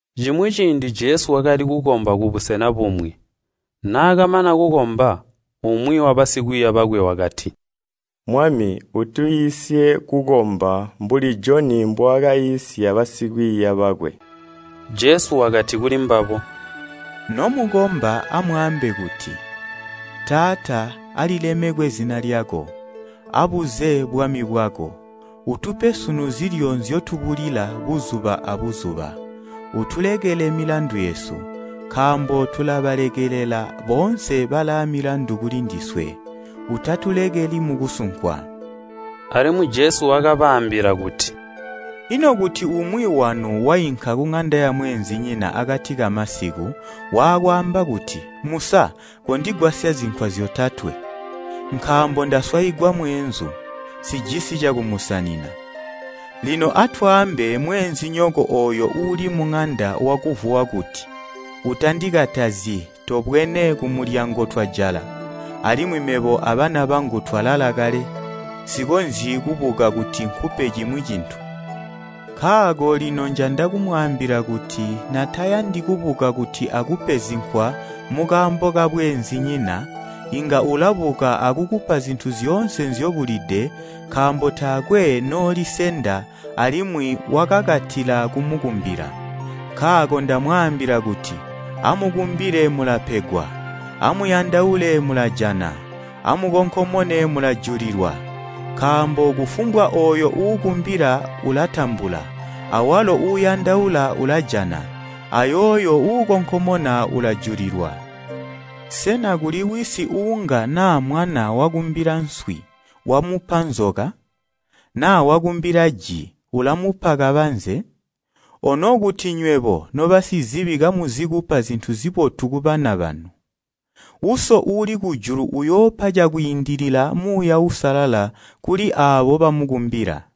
Cimwi ciindi Jesu wakali kukomba kubusena bumwi. Naakamana kukomba, umwi wabasikwiiya bakwe wakati, “Mwami, utwiisye kukomba mbuli Joni mbwaakaiisya basikwiiya bakwe.” Jesu wakati kulimbabo, “Nomukomba amwaambe kuti, ‘Taata, Alilemekwe zina lyako, Abuze bwami bwako. Utupe sunu zilyo nzyotubula buzuba abuzuba, Utulekele milandu yesu, nkaambo tulabalekelela boonse balaamilandu kulindiswe. Utatulekeli mukusunkwa.’” Alimwi Jesu wakabaambila kuti, “Ino kuti umwi wanu wainka kuŋanda yamweenzinyina akati kamasiku, waakwaamba kuti, ‘Musa, kondigwasya zinkwa zyotatwe, nkaambo ndaswaigwa mweenzu, nsijisi cakumusanina!’ Lino, atwaambe mweenzinyoko ooyo uuli muŋanda wakuvuwa kuti, ‘Utandikatazyi, tobwene, kumulyango twajala, alimwi mebo abana bangu twalala kale. Nsikonzyi kubuka kuti nkupe cimwi cintu.’ Nkaako lino njanda kumwaambila kuti natayandi kubuka kuti akupe zinkwa mukaambo kabweenzinyina, inga ulabuka akukupa zintu zyoonse nzyobulide nkaambo taakwe noolisenda, alimwi wakakatila kumukumbila. Nkaako ndamwaambila kuti, ‘Amukumbile mulapegwa, amuyandaule mulajana, amukonkomone mulajulilwa.’ Nkaambo kufumbwa ooyo uukumbila ulatambula, awalo uuyandaula ulajana, ayooyo uukonkomona ulajulilwa. Sena kuli wisi uunga naa mwana wakumbila nswi, wamupa nzoka? Na wakumbila ji, ulamupa kabanze? Kuti naa nywebo nobasizibi kamuzi kupa zintu zibotu kubana banu! Ino Uso uuli kujulu inga wakacilwa buti kupa Muuya Uusalala kuli aabo ‘bamukumbila!’”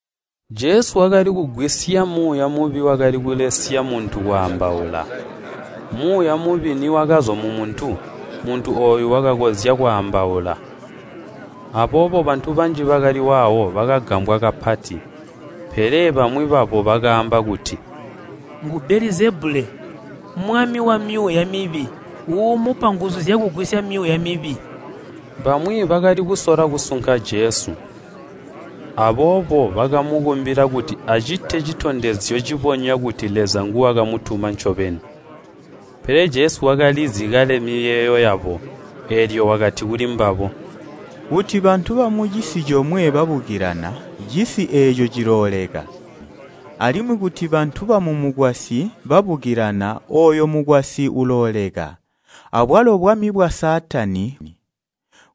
Jesu wakali kugwisya muuya mubi wakali kulesya muntu kwaambaula. Muuya mubi niwakazwa mumuntu, muntu ooyo wakakonzya kwaambaula. Aboobo bantu banji bakali waawo bakagambwa kapati. Pele bamwi babo bakaamba kuti, “Ngu Belizebule, mwami wamyuuya mibi uumupa nguzu zyakugwisya myuuya mibi.” Bamwi bakali kusola kusunka Jesu, aboobo bakamukumbila kuti acite citondezyo citondezya kuti Leza nguwakamutuma ncobeni. Pele Jesu wakalizi kale miyeeyo yabo, eelyo wakati kulimbabo, “Kuti bantu bamucisi comwe babukilana, cisi eeco cilooleka. Alimwi kuti bantu bamumukwasyi babukilana ooyo mukwasyi ulooleka. Abwalo bwami bwa Saatani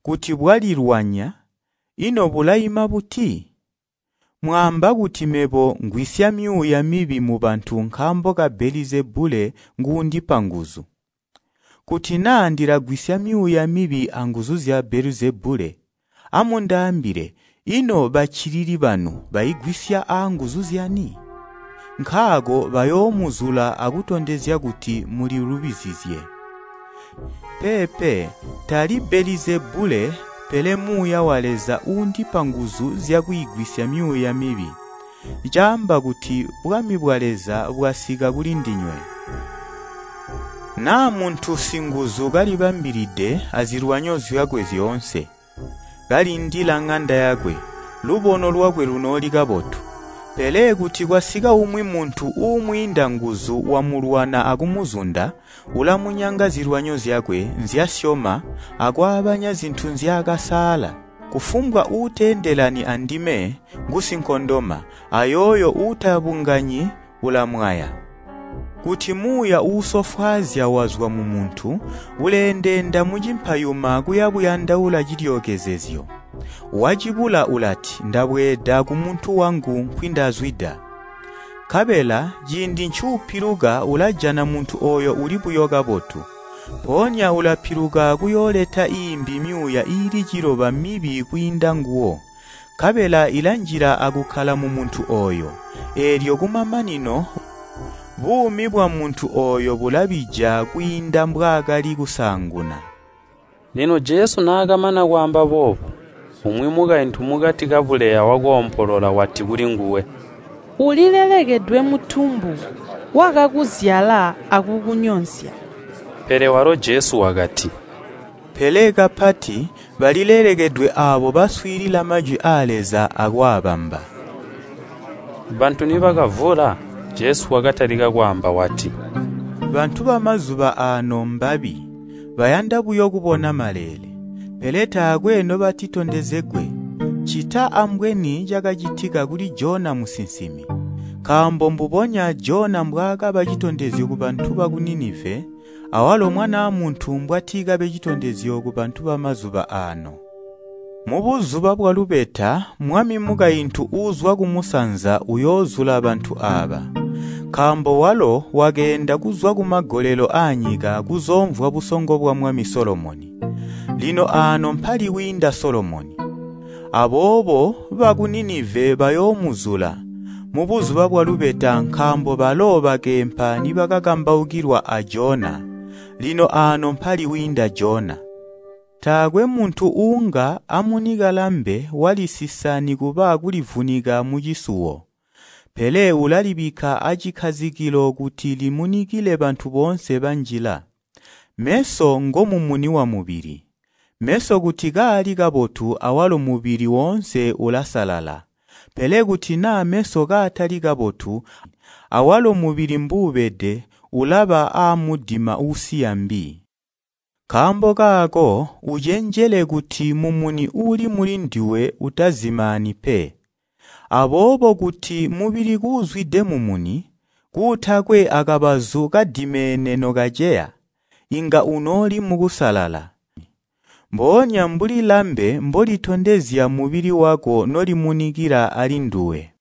kuti bwalilwanya, ino bulaima buti? Mwaamba kuti mebo ngwisya myuuya mibi mubantu nkaambo Belizebule nguundipa nguzu. Kuti naa ndilagwisya myuuya mibi anguzu zya Belizebule, amundaambile, ino baccilili banu baigwisya aanguzu zyani? Nkaako bayoomuzula akutondezya kuti mulilubizizye! Peepe tali Belizebule, pele Muuya wa Leza uundipa nguzu zyakwiigwisya myuuya mibi, caamba kuti bwami bwa Leza bwasika kuli ndinywe. “Naa muntu singuzu kalibambilide azilwanyo zyakwe zyoonse, kalindila ŋanda yakwe, lubono lwakwe lunooli kabotu. Pele kuti kwasika umwi muntu uumwiinda nguzu wamulwana akumuzunda, ulamunyanga zilwanyo zyakwe nzyasyoma akwaabanya zintu nzyaakasaala. “Kufumbwa uuteendelani andime, ngusinkondoma, ayooyo uutabunganyi, ulamwaya. “Kuti muuya uusofwaazya wazwa mumuntu, uleendeenda mucimpayuma kuya buyandaula cilyookezezyo. Wacibula ulati, ‘Ndabweeda kumuntu wangu nkwindazwida!’ Nkabela ciindi ncuupiluka ulajana muntu ooyo uli buyo kabotu. Mpoonya ulapiluka kuyooleta iimbi myuuya iili ciloba mibi kwiinda nguwo, nkabela ilanjila akukkala mumuntu ooyo. Eelyo kumamanino, buumi bwamuntu ooyo bulabija kwiinda mbwaakali kusaanguna.” Lino Jesu naakamana kwaamba boobu, umwi mukaintu mukati kabuleya wakoompolola wati kulinguwe, “Ulilelekedwe mutumbu wakakuzyala akukunyosya!” Pele walo Jesu wakati, “Pele kapati, balilelekedwe aabo baswiilila majwi aa Leza akwaabamba!” Bantu nibakavula, Jesu wakatalika kwaamba wati, “Bantu bamazuba aano mbabi. Bayanda buyo kubona maleele. Pele taakwe nobatitondezegwe, ccita ambweni cakacitika kuli Jona musinsimi. Nkaambo mbubonya Jona mbwaakaba citondezyo kubantu baku Nineva, awalo Mwanaa Muntu mbwati kabe citondezyo kubantu bamazuba aano. Mubuzuba bwalubeta mwami mukaintu uuzwa kumusanza uyoozula bantu aaba, nkaambo walo wakeenda kuzwa kumagolelo aanyika kuzoomvwa busongo bwamwami Solomoni. Lino aano mpali wiinda Solomoni. Aboobo baku Nineva bayoomuzula, mubuzuba bwalubeta nkaambo balo bakeempa nibakakambaukilwa a Jona. Lino aano mpali wiinda Jona! “Taakwe muntu uunga mbwaamunika lambe walisisa nikuba kulivunika mucisuwo, pele ulalibikka acikkazikilo kuti limunikile bantu boonse banjila. Meso ngomumuni wamubili. Meso kuti kaali kabotu awalo mubili woonse ulasalala. Pele kuti naa meso kaatali kabotu, awalo mubili mbuubede ulaba aamudima uusiya mbi. Nkaambo kaako ucenjele kuti mumuni uuli mulinduwe utazimaani pe. Aboobo kuti mubili kuuzwide mumuni, kuutakwe akabazu kadimeene nokaceya, inga unooli mukusalala, mboonya mbuli lambe mbolitondezya mubili wako nolimunikila alinduwe.”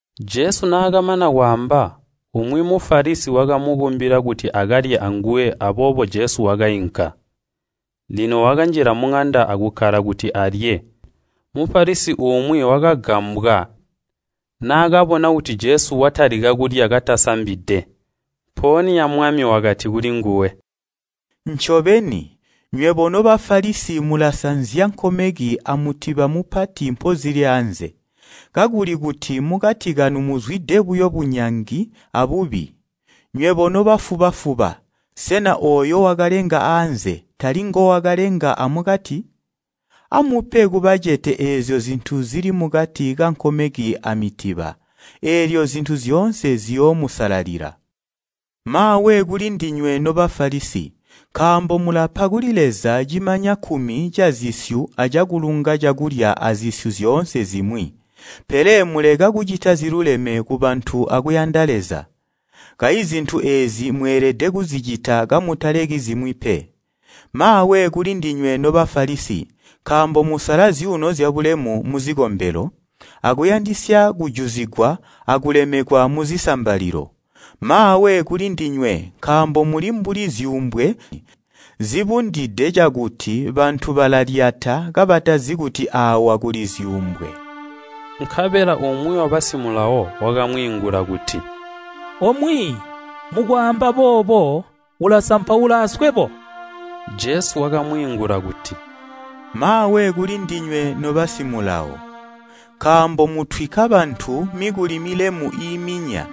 Jesu naakamana kwaamba, umwi Mufalisi wakamukumbila kuti akalye anguwe aboobo Jesu wakainka. Lino wakanjila muŋanda akukkala kuti alye. Mufalisi umwi wakagambwa naakabona kuti Jesu watalika kulya katasambide. Mpoonya Mwami wakati kulinguwe. “Ncobeni, nywebo no Bafalisi mulasanzya nkomeki amutiba mupati mpozili aanze, kakuli kuti mukati kanu muzwide buyo bunyangi abubi. Nywebo nobafuba-fuba! Sena ooyo wakalenga aanze, tali ngowakalenga amukati? Amupe kubacete eezyo zintu zili mukati kankomeki amitiba, eelyo zintu zyoonse ziyoomusalalila. “Maawe kulindinywe no Bafalisi. Nkaambo mulapa kuli Leza cimanya kkumi cazisyu acakulunga cakulya azisyu zyoonse zimwi, pele muleka kucita ziluleme kubantu akuyanda Leza. Kayi zintu eezi mweelede kuzicita kamutaleki zimwi pe. Maawe kulindinywe no Bafalisi! Nkaambo musala zyuuno zyabulemu muzikombelo, akuyandisya kujuzigwa akubulemekwa muzisambalilo. “Maawe kulindinywe, nkaambo muli mbuli zyuumbwe zibundide cakuti bantu balalyata kabatazi kuti aawa kuli zyuumbwe.” Nkabela umwi wabasimulawo wakamwiingula kuti. “Omwiiyi, mukwaamba boobo, ulasampaula aswebo!” Jesu wakamwiingula kuti, “Maawe kulindinywe, nobamayi ba Mulawo! Nkaambo mutwikka bantu mikuli milemu iiminya,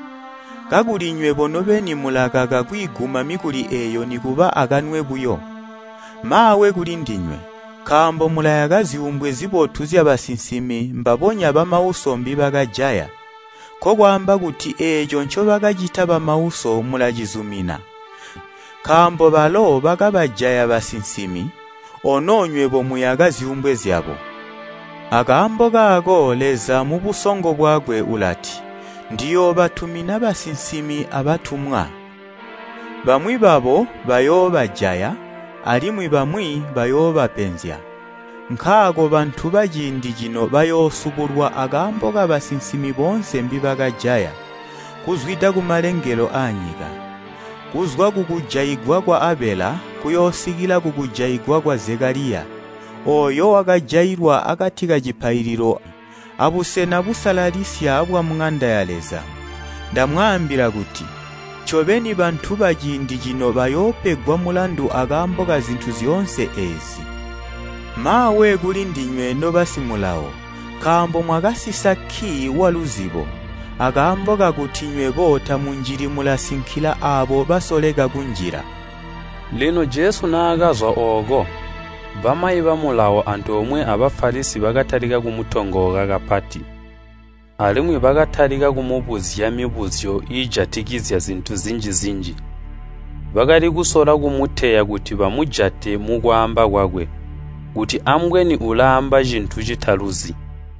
kakuli nywebo nobeni mulakaka kwiiguma mikuli eeyo nikuba akanwe buyo. “Maawe kulindinywe! Nkaambo mulayaka zyuumbwe zibotu zyabasinsimi mbabonya bamauso mbibakajaya. Nkokwaamba kuti eeco ncobakacita bamauso mulacizumina, nkaambo balo bakabajaya basinsimi, ono nywebo muyaka zyuumbwe zyabo. Akaambo kaako Leza mubusongo bwakwe ulati, ‘Ndiyoobatumina basinsimi abatumwa, bamwi babo bayoobajaya, alimwi bamwi bayoobapenzya.’ Nkaako bantu baciindi cino bayoosubulwa akaambo kabasinsimi boonse mbibakajaya, kuzwida kumalengelo aanyika, kuzwa kukujaigwa kwa Abela kuyoosikila kukujaigwa kwa Zekaliya, ooyo wakajailwa akati kacipaililo abusena busalalisya bwamuŋanda ya Leza. Ndamwaambila kuti, ncobeni bantu baciindi cino bayoopegwa mulandu akaambo kazintu zyoonse eezi! “Maawe kulindinywe, nobamayi ba Mulawo! Nkaambo mwakasisa kkii waluzibo. Akaambo kakuti nywebo tamunjili mulasinkila aabo basoleka kunjila!” Lino Jesu naakazwa ooko, bamayi ba Mulawo antoomwe a Bafalisi bakatalika kumutongooka kapati, alimwi bakatalika kumubuzya mibuzyo iijatikizya zintu zinji-zinji. Bakali kusola kumuteya kuti bamujate mukwaamba kwakwe, kuti ambweni ulaamba cintu citaluzi.